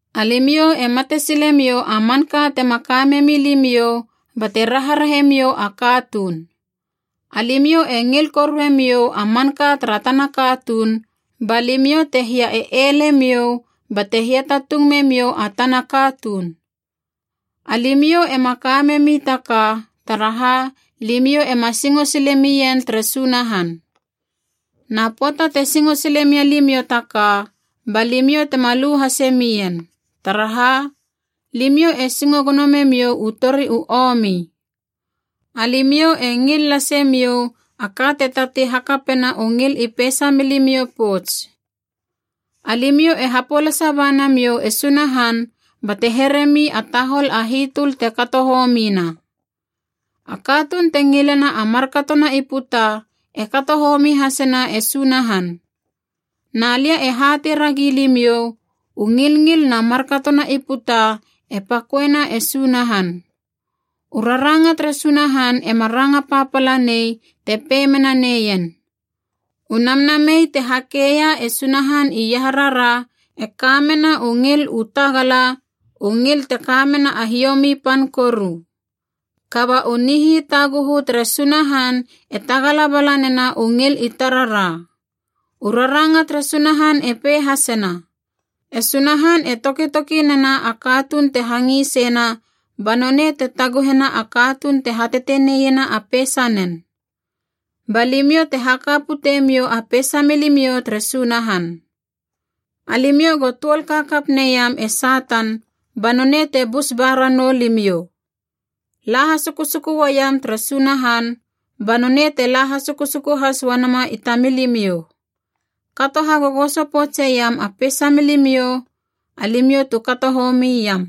Alimiou e matesilemiou a manka tema ka memi limiou bate rarahe miou a katuun. Alimiou e ngil koruemiou a manka tara tana katuun, ba limiou te hia e ele miou bate hiatatung memiou a tana katuun. Alimiou ema ka memi taka, taraha limiou ema singo sile mien tere Sunahan. Na pöata te singo sile mia limiou taka, ba limiou tema lu hase mien. Taraha, limiou e singo gono memiou u tori u omi. Alimiou e ngil lasemiou a ka te tatei hakapena u ngil i peisa milimiou pouts. Alimiou e hapolasa ba namiou e Sunahan bate heremi a tahol a hitöl te kato homina. A katuun te ngilena a markatona i puta e kato homi hasena e Sunahan. Na lia e hatei ragi limiou, u ngilngil na markatona i puta e paköena e Sunahan. U raranga tere Sunahan ema ranga papala nei te pei mena neien, “U namnamei te hakeia e Sunahan iaharara e ka mena u ngil u tagala, u ngil te kamena a hiomi pan koru.” Kaba u nihitaguhu tere Sunahan e tagala bala nena u ngil i tarara. U raranga tere Sunahan e pei hasena, “E Sunahan e tokitoki nena a katuun te hangisena ba nonei te taguhena a katuun te hateteneiena a peisanen.” Ba limiou te haka putemiou a peisa milimiou tere Sunahan. Alimiou go tuol kakap neiam e Satan ba nonei te bus ba ranou limiou. La hasukusuku uaiam tere Sunahan, ba nonei te la hasukusuku has uanama i tamilimiou. Kato hagogoso poutseiam a peisa milimiou, alimiou tu kato homi iam.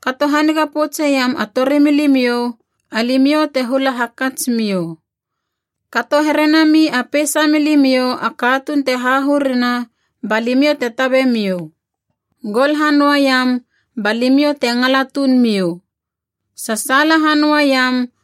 Kato haniga poutseiam a torimilimiou, alimiou te hula hakatsmiou. Kato here nami a peisa milimiou a katuun te hahurina, ba limiou te tabemiou. Gol hanöaiam, ba limiou te ngala tuun miou. Sasaala hanöaiam,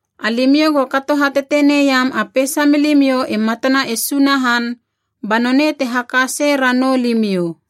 Alimiou go kato hateteneiam a peisa milimiou i matana e Sunahan, ba nonei te haka sei ranou limiou.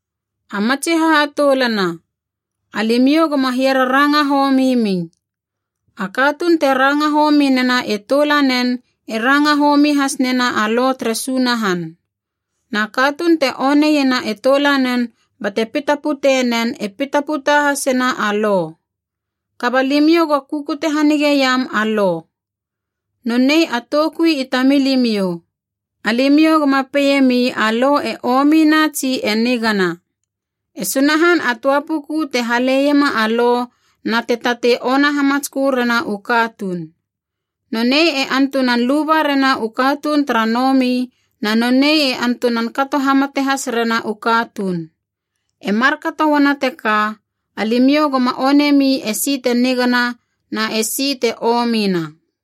A matsi hahatoulana, alimiou goma hiararanga homi mi. A katuun te ranga homi nena e toulanen e ranga homi has nena a Lo tere Sunahan. Na katuun te oneiena e toulanen bate pita pute nen e pita puta hasena a Lo. Kaba limiou go kukute hanigeiam a Lo. Nonei a toukui i tamilimiou. Alimiou goma peiemi a Lo e omina tsi e nigana. E Sunahan a töa puku te haleiema a Lo na te tatei ona hamatskö rena u katuun. Nonei e antunan luba rena u katuun tara nomi na nonei e antunan kato hamate has rena u katuun. E markato uana teka, alimiou goma onemi esi te nigana na e si te omina.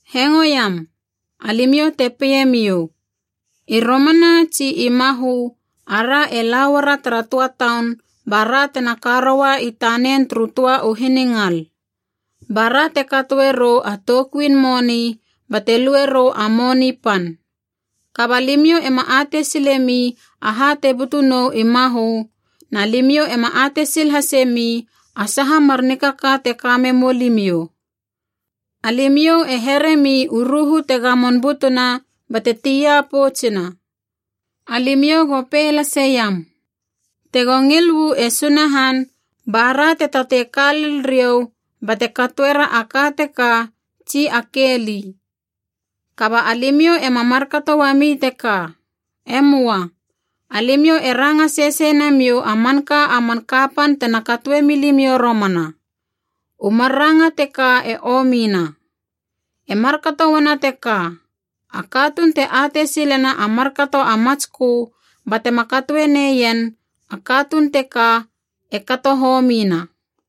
Hengoiam, alimiou te peiemiou, “I romana tsi i mahö a ra e lauara tara töa taun bara tena ka roua i tanen turu töa u hiningal. Ba ra te katoe rou a toukuin moni bate lue rou a moni pan.” Kaba limiou ema atei silemi aha te butu nou i mahö, na limiou ema atei sil hasemi a saha mar nikaka te ka memou limiou. Alimiou e here mi u ruhu te gamon butuna bate tia poutsuna. Alimiou go pei lasiam, “Te go ngil uu e Sunahan bara te tatei ka lel riou bate katoera a ka teka tsi a ke li.” Kaba alimiou ema markato uami teka. E möa. Alimiou e ranga sesei namiou a manka a man kapan tena katoemi limiou romana. U mar ranga teka e omina. E markato uana teka, a katuun te atei silena a markato a matskö batema katoe neien, a katuun teka e kato homina.